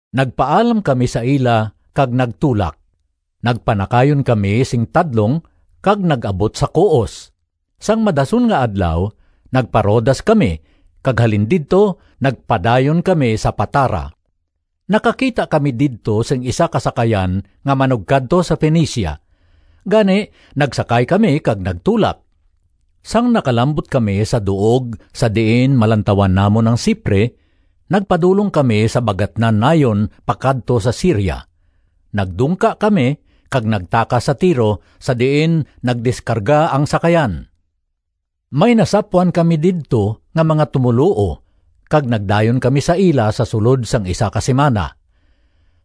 Nagpaalam kami sa ila kag nagtulak. Nagpanakayon kami sing tadlong kag nag-abot sa Coos. Sang madason nga adlaw nagpa-Rodas kami kag halin didto nagpadayon kami sa Patara. Nakakita kami didto sing isa ka sakayan nga manugkadto sa Fenicia. Gani nagsakay kami kag nagtulak. Sang nakalambot kami sa duog sa diin malantawan namon ang Cipre, nagpadulong kami sa bagatnan nayon pakadto sa Siria. Nagdungka kami kag nagtakas sa Tiro sa diin nagdiskarga ang sakayan. May nasapwan kami didto nga mga tumoluo kag nagdayon kami sa ila sa sulod sang isa ka simana.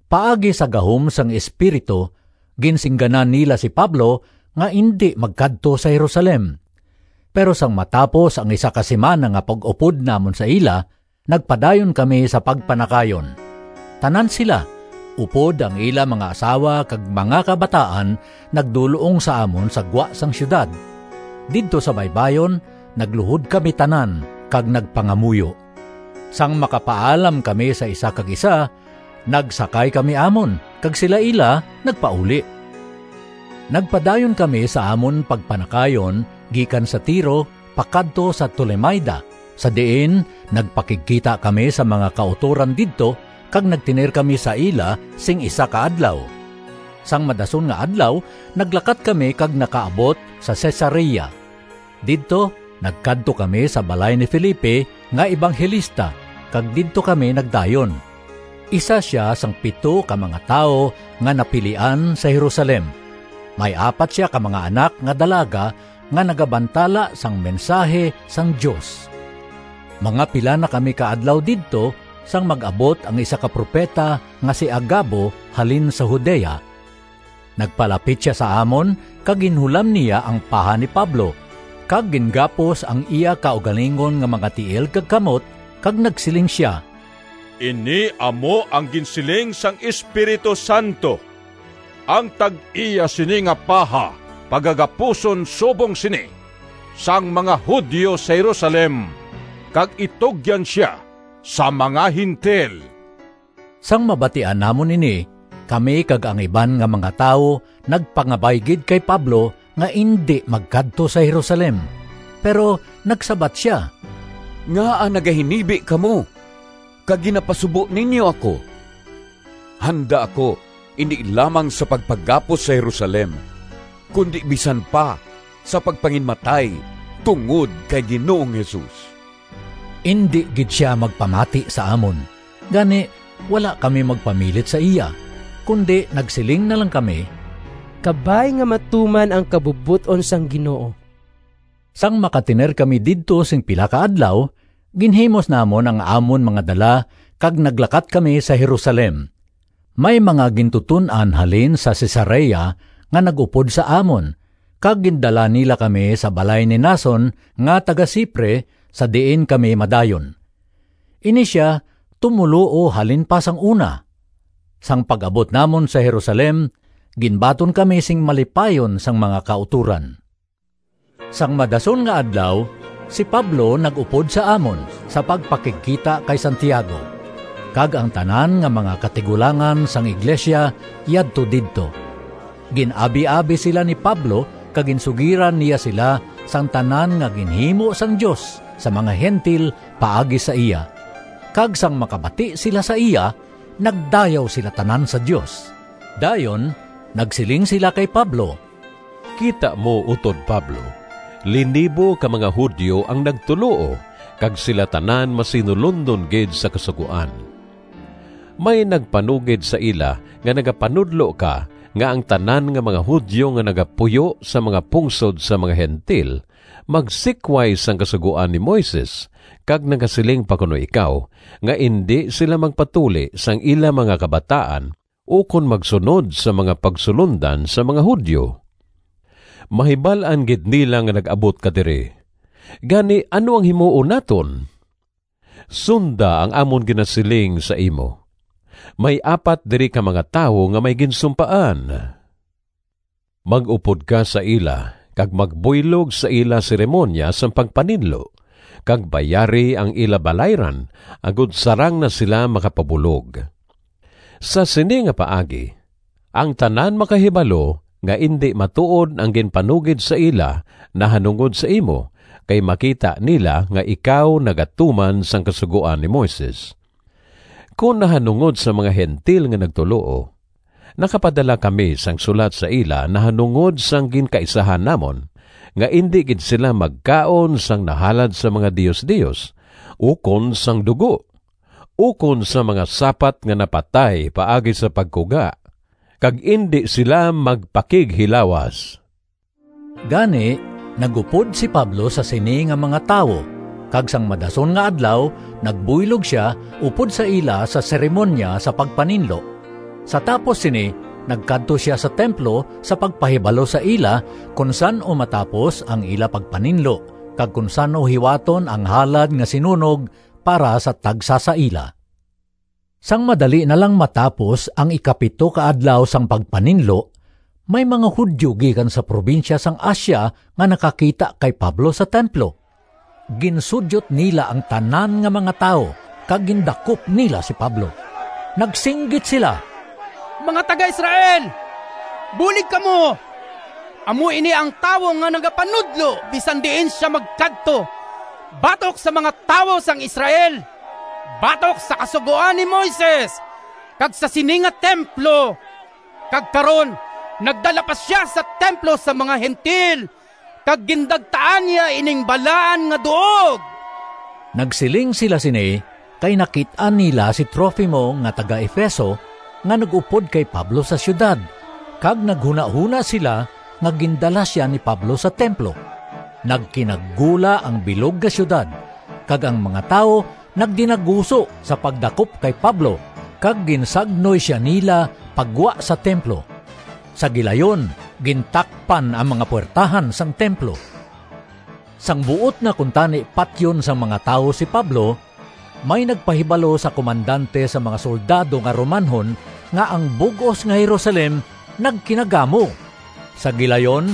Paagi sa gahom sang Espiritu ginsingganan nila si Pablo nga indi magkadto sa Jerusalem. Pero sang matapos ang isa ka simana nga pag-upod namon sa ila, nagpadayon kami sa pagpanakayon. Tanan sila, upod ang ila mga asawa kag mga kabataan nagdul-ong sa amon sa gwa sang siyudad. Didto sa baybayon, nagluhod kami tanan kag nagpangamuyo. Sang makapaalam kami sa isa kag isa, nagsakay kami amon kag sila ila nagpauli. Nagpadayon kami sa amon pagpanakayon gikan sa Tiro pakadto sa Tolemaida, sa diin nagpakigkita kami sa mga kautoran didto kag nagtener kami sa ila sing isa ka adlaw. Sang madason nga adlaw naglakat kami kag nakaabot sa Cesarea. Didto nagkadto kami sa balay ni Felipe nga ebanghelista kag didto kami nagdayon. Isa sia sang pito ka mga tawo nga napilian sa Jerusalem. May apat sia ka mga anak nga dalaga nga nagabantala sang mensahi sang Dios. Mga pila na kami ka adlaw didto sang mag-abot ang isa ka propeta nga si Agabo halin sa Judea. Nagpalapit sia sa amon kag ginhulam niya ang paha ni Pablo kag gingapos ang iya kaugalingon nga mga tiil kag kamot kag nagsiling sia, “Ini amo ang ginsiling sang Espiritu Santo: Ang tag-iya sini nga paha pagagapuson subong sini sang mga Judio sa Jerusalem, kag itugyan sia sa mga Gentil.” Sang mabatian namon ini, kami kag ang iban nga mga tawo nagpangabay gid kay Pablo nga indi magkadto sa Jerusalem. Pero nagsabat sia, “Ngaa nagahinibi kamo kag ginapasubo ninyo ako? Handa ako indi lamang sa pagpagapos sa Jerusalem, kundi bisan pa sa pagpanginmatay tungod kay Ginoong Jesus.” Indi gid sia magpamati sa amon. Gani wala kami magpamilit sa iya, kundi nagsiling na lang kami, “Kabay nga matuman ang kabubot-on sang Ginoo.” Sang makatener kami didto sing pila ka adlaw, ginhimos namon ang amon mga dala kag naglakat kami sa Jerusalem. May mga gintuton-an halin sa Cesarea nga nag-upod sa amon kag gindala nila kami sa balay ni Mnason nga taga-Cipre sa diin kami madayon. Ini sia tumoluo halin pa sang una. Sang pag-abot namon sa Jerusalem, ginbaton kami sing malipayon sang mga kautoran. Sang madason nga adlaw, si Pablo nag-upod sa amon sa pagpakigkita kay Santiago, kag ang tanan nga mga katigulangan sang iglesia yadto didto. Gin-abiabi sila ni Pablo kag ginsugiran niya sila sang tanan nga ginhimo sang Dios sa mga Gentil paagi sa iya. Kag sang makabati sila sa iya, nagdayaw sila tanan sa Dios. Dayon nagsiling sila kay Pablo, “Kita mo, utod Pablo, linibo ka mga Judio ang nagtuloo kag sila tanan masinulondon gid sa Kasugoan. May nagpanugid sa ila nga nagapanudlo ka nga ang tanan nga mga Judio nga nagapuyo sa mga pungsod sang mga Gentil magsikway sang Kasugoan ni Moises kag nagasiling pa kuno ikaw nga indi sila magpatuli sang ila mga kabataan ukon magsunod sang mga pagsulondan sang mga Judio. Mahibal-an gid nila nga nag-abot ka diri. Gani ano ang himuon naton? Sunda ang amon ginasiling sa imo. May apat diri ka mga tawo nga may ginsumpaan. Mag-upod ka sa ila kag magbuylog sa ila seremoniya sang pagpaninlo kag bayari ang ila balayran agod sarang na sila makapabulog. Sa sini nga paagi ang tanan makahibalo nga indi matuod ang ginpanugid sa ila nahanungod sa imo kay makita nila nga ikaw nagatuman sang Kasugoan ni Moises. Kon nahanungod sa mga Gentil nga nagtuloo, nakapadala kami sang sulat sa ila nahanungod sang ginkaisahan namon nga indi gid sila magkaon sang nahalad sa mga diosdios ukon sang dugo ukon sang mga sapat nga napatay paagi sa pagkuga, kag indi sila magpakighilawas.” Gani nag-upod si Pablo sa sini nga mga tawo kag sang madason nga adlaw nagbuylog sia upod sa ila sa seremoniya sa pagpaninlo. Sa tapos sini nagkadto sia sa templo sa pagpahibalo sa ila kon san-o matapos ang ila pagpaninlo, kag kon san-o hiwaton ang halad nga sinunog para sa tagsa sa ila. Sang madali na lang matapos ang ikapito ka adlaw sang pagpaninlo, may mga Judio gikan sa probinsya sang Asia nga nakakita kay Pablo sa templo. Ginsudyot nila ang tanan nga mga tawo kag gindakop nila si Pablo. Nagsinggit sila, “Mga taga-Israel, bulig kamo! Amo ini ang tawo nga nagapanudlo bisan diin sia magkadto batok sa mga tawo sang Israel, batok sa Kasugoan ni Moises kag sa sini nga templo. Kag karon nagdala pa sia sa templo sang mga Gentil kag gindagtaan niya ining balaan nga duog!” (Nagsiling sila sini kay nakit-an nila si Trofimo nga taga-Efeso nga nag-upod kay Pablo sa siyudad, kag naghunahona sila nga gindala sia ni Pablo sa templo.) Nagkinagula ang bilog nga siyudad kag ang mga tawo nagdinaguso sa pagdakop kay Pablo kag ginsagnoy sia nila pa gwa sa templo. Sa gilayon gintakpan ang mga puwertahan sang templo. Sang buot na kuntani patyon sang mga tawo si Pablo, may nagpahibalo sa komandante sang mga soldado nga Romanhon nga ang bug-os nga Jerusalem nagkinagamo. Sa gilayon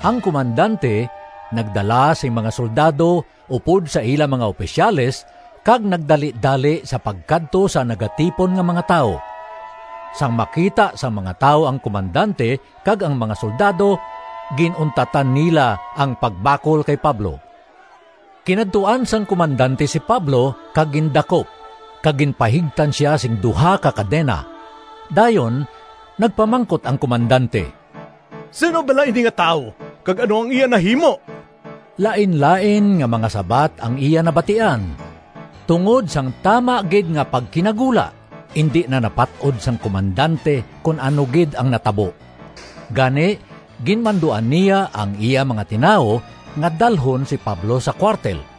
ang komandante nagdala sing mga soldado upod sa ila mga opisyales kag nagdalidali sa pagkadto sa nagatipon nga mga tawo. Sang makita sang mga tawo ang komandante kag ang mga soldado gin-untatan nila ang pagbakol kay Pablo. Kinadtuan sang komandante si Pablo kag gindakop kag ginpahigtan sia sing duha ka kadena. Dayon nagpamangkot ang komandante, “Sin-o bala ini nga tawo kag ano ang iya nahimo?” Lainlain nga mga sabat ang iya nabatian. Tungod sang tama gid nga pagkinagula indi na napat-od sang komandante kon ano gid ang natabo. Gani, ginmanduan niya ang iya mga tinawo nga dalhon si Pablo sa kuwartel.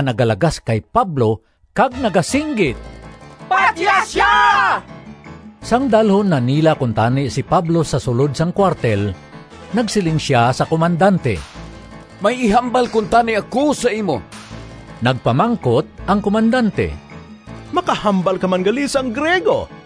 nagalagas kay Pablo kag nagasinggit, “Patya sia!” Sang dalhon na nila kuntani si Pablo sa sulod sang kuwartel, nagsiling sia sa komandante, “May ihambal kuntani ako sa imo.” Nagpamangkot ang komandante, “Makahambal ka man gali sang Griego?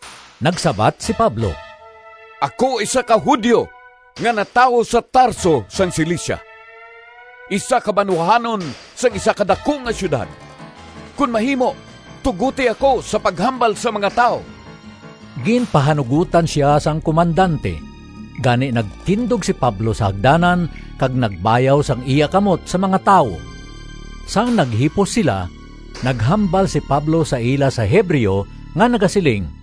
Nagsabat si Pablo, “Ako isa ka Judio nga natawo sa Tarso sang Cilicia, isa ka banwahanon sang isa ka daku nga siyudad. Kon mahimo, tugoti ako sa paghambal sa mga tawo.” Ginpahanugotan sia sang komandante, gani nagtindog si Pablo sa hagdanan kag nagbayaw sang iya kamot sa mga tawo. Sang naghipos sila, naghambal si Pablo sa ila sa Hebreo nga nagasiling: